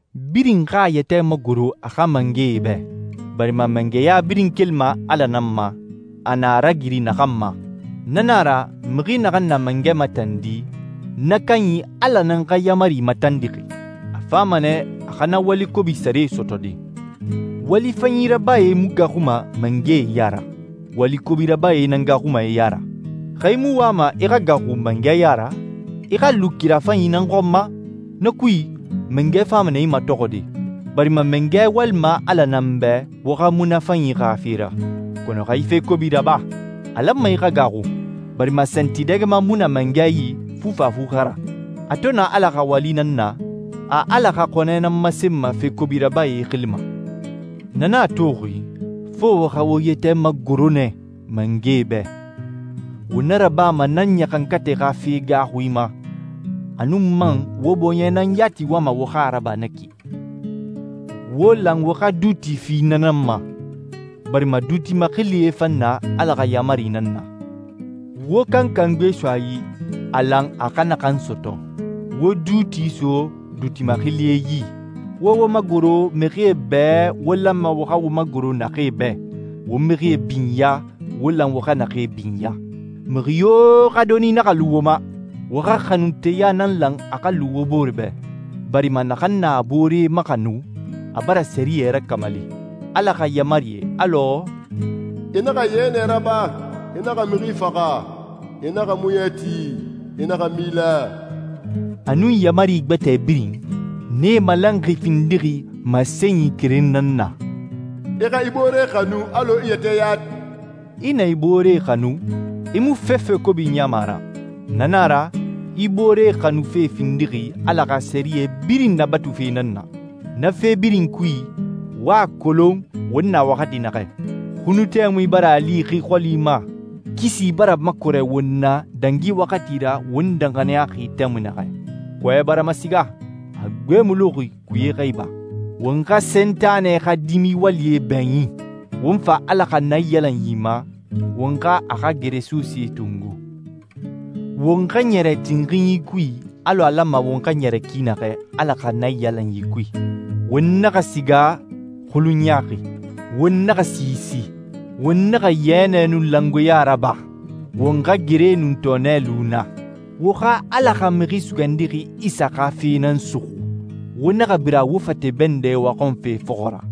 Birin xa a yɛtɛ magoro a xa mangɛe bɛ, barima mangɛya birin kelima Ala nan ma, a na a ragiri naxan ma. Na nan a ra, mixi naxan na mangɛ matandi, na kanyi Ala nan xa yaamari matandixi. A fama nɛ a xa na wali kobi sare sɔtɔde. Wali fanyi rabae mu gaaxuma mangɛe ya ra, wali kobi rabae nan gaaxuma e ya ra. Xa i mu wama i xa gaaxu mangɛ ya ra, i xa lu kira fanyi nan xɔn ma. Na kui, mangɛ fama nɛ i matɔxɔde, barima mangɛ walima Ala nan bɛ wo xa munafanyi xa fe ra. Kɔnɔ xa i fe kobi raba, a lanma i xa gaaxu, barima santidɛgɛma mu na mangɛ yi fufafu xa ra. A to na Ala xa wali nan na, a Ala xa xɔnɛ nan masenma fe kobi rabae xili ma. Na nan a toxi, fo wo xa wo yɛtɛ magoro nɛ mangɛe bɛ. Wo na rabama na ɲaxankatɛ xa fe gaaxui ma, a nun man wo bɔɲɛ nan yati wama wo xa a raba na ki. Wo lan wo xa duuti fi na nan ma, barima duuti maxilie fan na Ala xa yaamari nan na. Wo kankan gbe so a yi, a lan a xa naxan sɔtɔ. Wo duuti so duuti maxilie yi, wo wo magoro mixie bɛ wo lanma wo xa wo magoro naxee bɛ, wo mixie binya wo lan wo xa naxee binya. Mixi yo xa doni naxa lu wo ma, wo xa xanunteya nan lan a xa lu wo bore bɛ, barima naxan na a boore maxanu, a bara sɛriyɛ rakamali. Ala xa yaamarie alɔ, «I naxa yɛnɛ raba, i naxa mixi faxa, i naxa muɲɛ ti, i naxa mila,» a nun yaamari gbɛtɛe birin, nee malanxi findixi masenyi keren nan na: I xa i boore xanu alɔ i yɛtɛ yati. I na i boore xanu, i mu fefe kobi niyama a ra. Na na a ra, i boore xanufe findixi Ala xa sɛriyɛ birin nabatufe nan na. Na fe birin kui, wo a kolon won na waxati naxɛ. Xunu tɛmui bara a li xi xɔli ma, kisi bara makɔrɛ won na dangi waxati ra won danxaniyaxi tɛmui naxɛ. Kɔɛ bara masiga, a gbe mu luxi kuye xa iba. Won xa Sentanɛ xa dimi walie bɛɲin, won fa Ala xa naiyalanyi ma, won xa a xa geresosee tongo. Won xa ɲɛrɛ tinxinyi kui alɔ a lanma won xa ɲɛrɛ ki naxɛ Ala xa naiyalanyi kui. Won naxa siga xulun ɲaaxi, won naxa siisi, won naxa yɛnɛ nun langoeɲa raba, won xa gere nun tɔɔnɛ lu na. Wo xa Ala xa Mixi Sugandixi Isa xa fe nan suxu, wo naxa bira wo fate bɛndɛ waxɔnfe fɔxɔ ra.